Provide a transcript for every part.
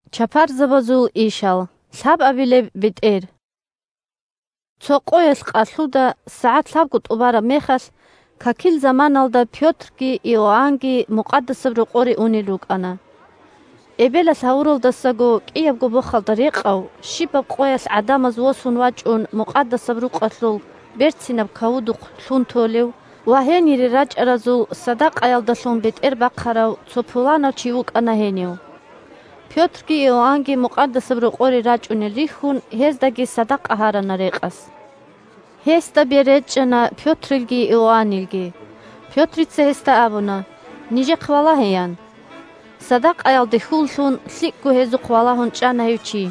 бетӀер Пётрица рекъав чи сахлъизавула 1Цо къоялъ къалъуда, сагӀат лъабго тӀубараб мехалъ, какил заманалда Пётрги Иоаннги Мукъадасаб Рокъоре унел рукӀана. 2Эбелалъ гьавуралдасаго кӀиябго бохалда рекъав, щибаб къоялъ гӀадамаз восун вачӀун Мукъадасаб Рукъалъул «Берцинаб кавудухъ» лъун толев ва гьенире рачӀаразул садакъаялдалъун бетӀербахъарав цо пуланав чи вукӀана гьенив. 3Пётрги Иоаннги Мукъадасаб Рокъоре рачӀунел рихьун, гьездаги садакъа гьарана рекъас. Гьесда бер речӀчӀана Пётрилги Иоаннилги. Пётрица гьесда абуна: – Нижехъ валагье! – ян. Садакъаялде хьул лъун, лъикӀго гьезухъ валагьун чӀана гьев чи.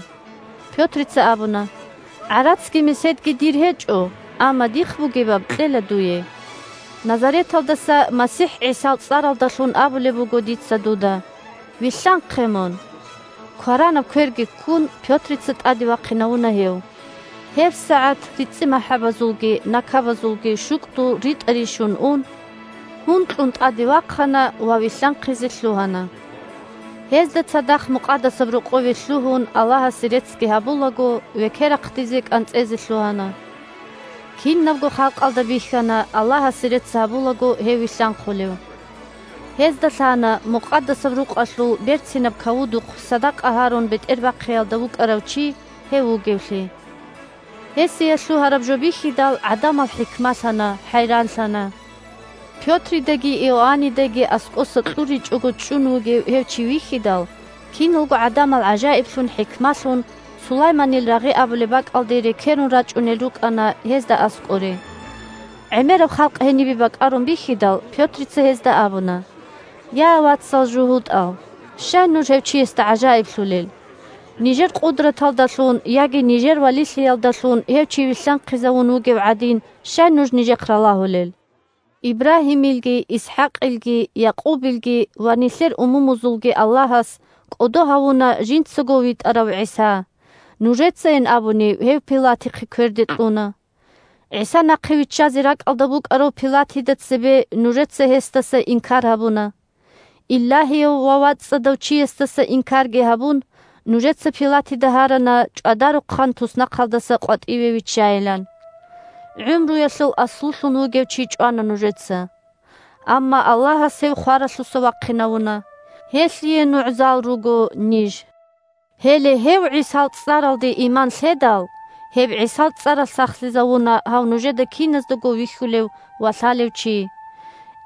Пётрица абуна: – ГӀарацги меседги дир гьечӀо, амма дихъ бугебаб кьела дуе. Назареталдаса МасихӀ ГӀисал цӀаралдалъун абулеб буго дица дуда: вилълъанхъе мун! Кваранаб кверги ккун, Пётрица тӀаде вахъинавуна гьев. ГьебсагӀат рицӀимахӀабазулги накабазулги щукӀдул ритӀа-ришун ун, гьункьун тӀаде вахъана ва вилълъанхъизе лъугьана. Гьезда цадахъ Мукъадасаб Рокъове лъугьун, Аллагьасе реццги гьабулаго, векерахъдизе-кӀанцӀезе лъугьана. Кинабго халкъалда бихьана, Аллагьасе рецц гьабулаго, гьев вилълъанхъулев. Гьезда лъана Мукъадасаб Рукъалъул «Берцинаб кавудухъ» садакъа гьарун бетӀербахъиялда вукӀарав чи гьев вугевлъи. Гьесие лъугьараб жо бихьидал, гӀадамал хӀикмалъана, хӀайранлъана. Пётридаги Иоаннидаги аскӀоса кьуричӀого чӀун вугев гьев чи вихьидал, киналго гӀадамал гӀажаиблъун-хӀикмалъун Сулайманил рагъи абулеб бакӀалде рекерун рачӀунел рукӀана гьезда аскӀоре. ГӀемераб халкъ гьенибе бакӀарун бихьидал, Пётрица гьезда абуна: – Я, вацал жугьутӀал! Щай нуж гьев чиясда гӀажаиблъулел? Нижер къудраталдалъун яги нижер валилъиялдалъун гьев чи вилълъанхъизавун вугев гӀадин щай нуж нижехъ ралагьулел? Ибрагьимилги, ИсхӀакъилги, Якъубилги ва нилъер умумузулги Аллагьас кӀодо гьавуна жинцаго витӀарав ГӀиса. Нужецайин абуни гьев Пилатил кверде кьуна. ГӀиса нахъе виччазе ракӀалда букӀарав Пилатида цебе нужеца гьесдаса инкар гьабуна. Илагьияв ва вацӀцӀадав чиясдаса инкарги гьабун, нужеца Пилатида гьарана чӀвадарухъан туснахъалдаса къватӀиве виччайилан. ГӀумруялъул аслулъун вугев чи чӀвана нужеца. Амма Аллагьас гьев хваралъуса вахъинавуна. Гьелъие нугӀзал руго ниж. Гьеле гьев ГӀисал цӀаралде иман лъедал, гьеб ГӀисал цӀаралъ сахлъизавуна гьав нужеда киназдаго вихьулев ва лъалев чи.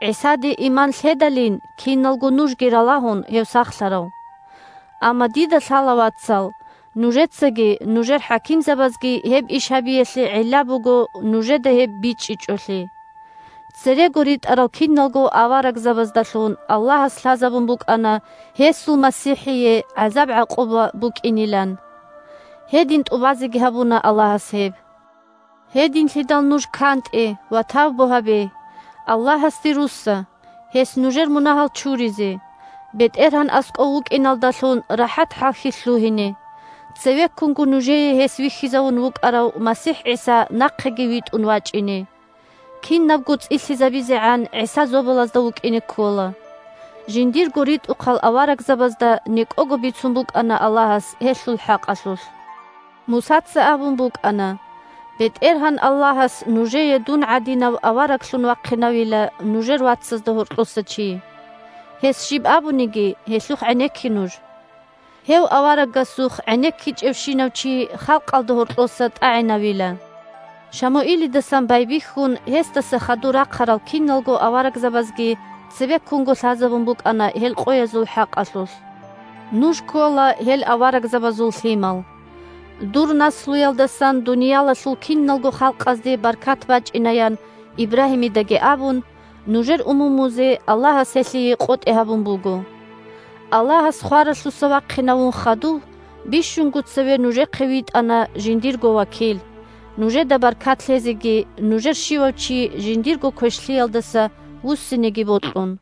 ГӀисаде иман лъедалин, киналго нужги ралагьун, гьев сахлъарав. Амма дида лъала, вацал, нужецаги нужер хӀакимзабазги гьеб иш гьабиялъе гӀилла буго нужеда гьеб бичӀчӀичӀолъи. Церего ритӀарал киналго аварагзабаздалъун Аллагьас лъазабун букӀана гьесул МасихӀие гӀазаб-гӀакъуба букӀинилан. Гьедин тӀубазеги гьабуна Аллагьас гьеб. Гьединлъидал нуж кантӀе ва тавбу гьабе, Аллагьасде русса, гьес нужер мунагьал чуризе, БетӀергьан аскӀов вукӀиналдалъун рахӀат-хӀалхьи лъугьине, цевеккунго нужее гьес вихьизавун вукӀарав МасихӀ ГӀиса нахъеги витӀун вачӀине. Кинабго цӀилъизабизегӀан ГӀиса зобалазда вукӀине ккола. Жиндирго ритӀухъал аварагзабазда некӀого бицун букӀана Аллагьас гьелъул хӀакъалъулъ. Мусаца абун букӀана: «БетӀергьан Аллагьас нужее дун гӀадинав авараглъун вахъинавила нужер вацазда гьоркьоса чи. Гьес щиб абуниги, гьелъухъ гӀенекке нуж. Гьев аварагасухъ гӀенеккичӀевщинав чи халкъалда гьоркьоса тӀагӀинавила». Шамуилидасан байбихьун гьесдаса хадур рахъарал киналго аварагзабазги цебеккунго лъазабун букӀана гьел къоязул хӀакъалъулъ. Нуж ккола гьел аварагзабазул лъимал. «Дур наслуялдасан дуниялалъул киналго халкъазде баркат бачӀина», – ян Ибрагьимидаги абун, нужер умумузе Аллагьас гьелъие къотӀи гьабун буго. Аллагьас хваралъуса вахъинавун хадув бищунго цеве нужехъе витӀана жиндирго вакил, нужеда баркат лъезеги нужер щивав чи жиндирго квешлъиялдаса вуссинеги бокьун.